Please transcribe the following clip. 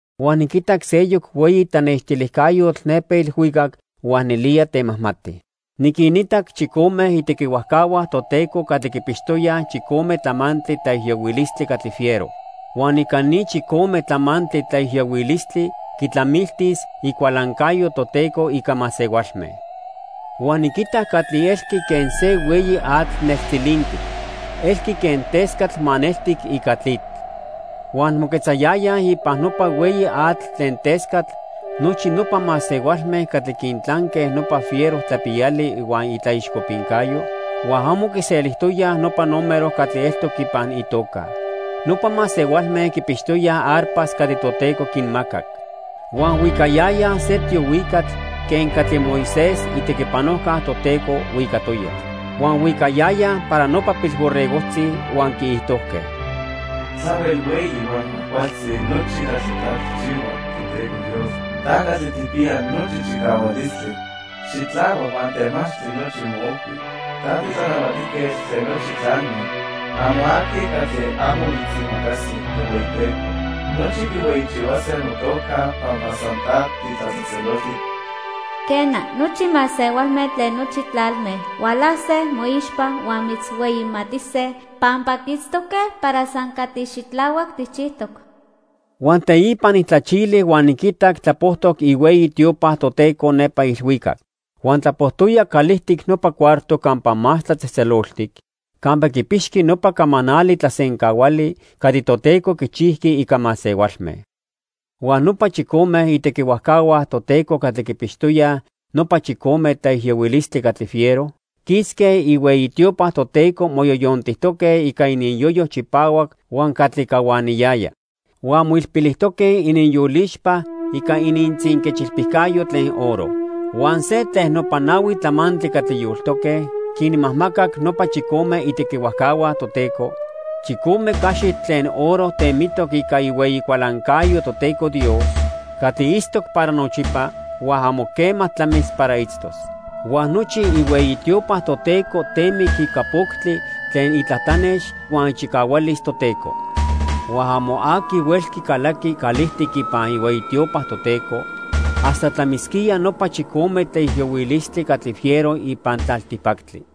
Huan niquitac seyoc hueyi tlanextilijcayotl nepa ilhuicac huan nelía temajmati. Niquinitac chicome itequihuajcahua Toteco catli quipixtoyaj chicome tlamantli tlaijiyohuilistli catli fiero. Huan ica ni chicome tlamantli tlaijiyohuilistli quitlamiltis icualancayo Toteco ica masehualme. Huan niquitac catli elqui quen se hueyi atl neltzilintic. Elqui quen tescatl maneltic ica tlitl. Huan moquetzayayaj ipan nopa hueyi atl tlen tescatl nochi nopa masehualme catli quintlanque nopa fiero tlapiyali huan itlaixcopincayo, huan amo quiselijtoyaj nopa número catli eltoc ipan itoca. Nopa masehualme quipixtoyaj arpas catli Toteco quinmacac. Huan huicayayaj se tiohuicatl quen catli Moisés, itequipanojca Toteco, huicatoya. Huan huicayayaj para nopa Pilborregojtzi, huan quiijtojque: "Tlahuel hueyi huan cuajcualtzi nochi catli ta tijchihua, Toteco Dios. Ta Catli Tijpiya Nochi Chicahualistli. Xitlahuac huan temachtli nochi moojhui. Ta tiTlanahuatijquetl tlen nochi tlalme. Amo aqui catli amo mitzimacasi, Tohueyiteco. Nochi quihueyichihuase motoca pampa san ta titlatzejtzeloltic. Quena, nochi masehualme tlen nochi tlalme hualase moixpa huan mitzhueyimatise, pampa quiitztoque para san catli xitlahuac tijchijtoc." Huan teipa nijtlachili huan niquitac tlapojtoc ihueyi tiopa Toteco nepa ilhuicac. Huan tlapojtoya calijtic nopa cuarto Campa Más Tlatzejtzeloltic campa quipixqui nopa camanali tlasencahuali catli Toteco quichijqui ica masehualme. Huan nopa chicome itequihuajcahua Toteco catli quipixtoyaj nopa chicome tlaijiyohuilistli catli fiero quisque ihueyi tiopa Toteco moyoyontijtoque ica ininyoyo chipahuac huan catli cahuaniyaya. Huan moilpilitoque ininyolixpa ica inintzinquechilpicayo tlen oro. Huan se tlen nopa nahui tlamantli catli yoltoque quinmajmacac nopa chicome itequihuajcahua Toteco chicome caxitl tlen oro temitoc ica ihueyi cualancayo Toteco Dios catli itztoc para nochipa huan amo quema tlamis para itztos. Huan nochi ihueyi tiopa Toteco temic ica poctli tlen itlatlanex huan ichicahualis Toteco. Huan amo aqui huelqui calaqui calijtic ipan ihueyi tiopa Toteco hasta tlamisquía nopa chicome tlaijiyohuilistli catli fiero ipan tlaltipactli.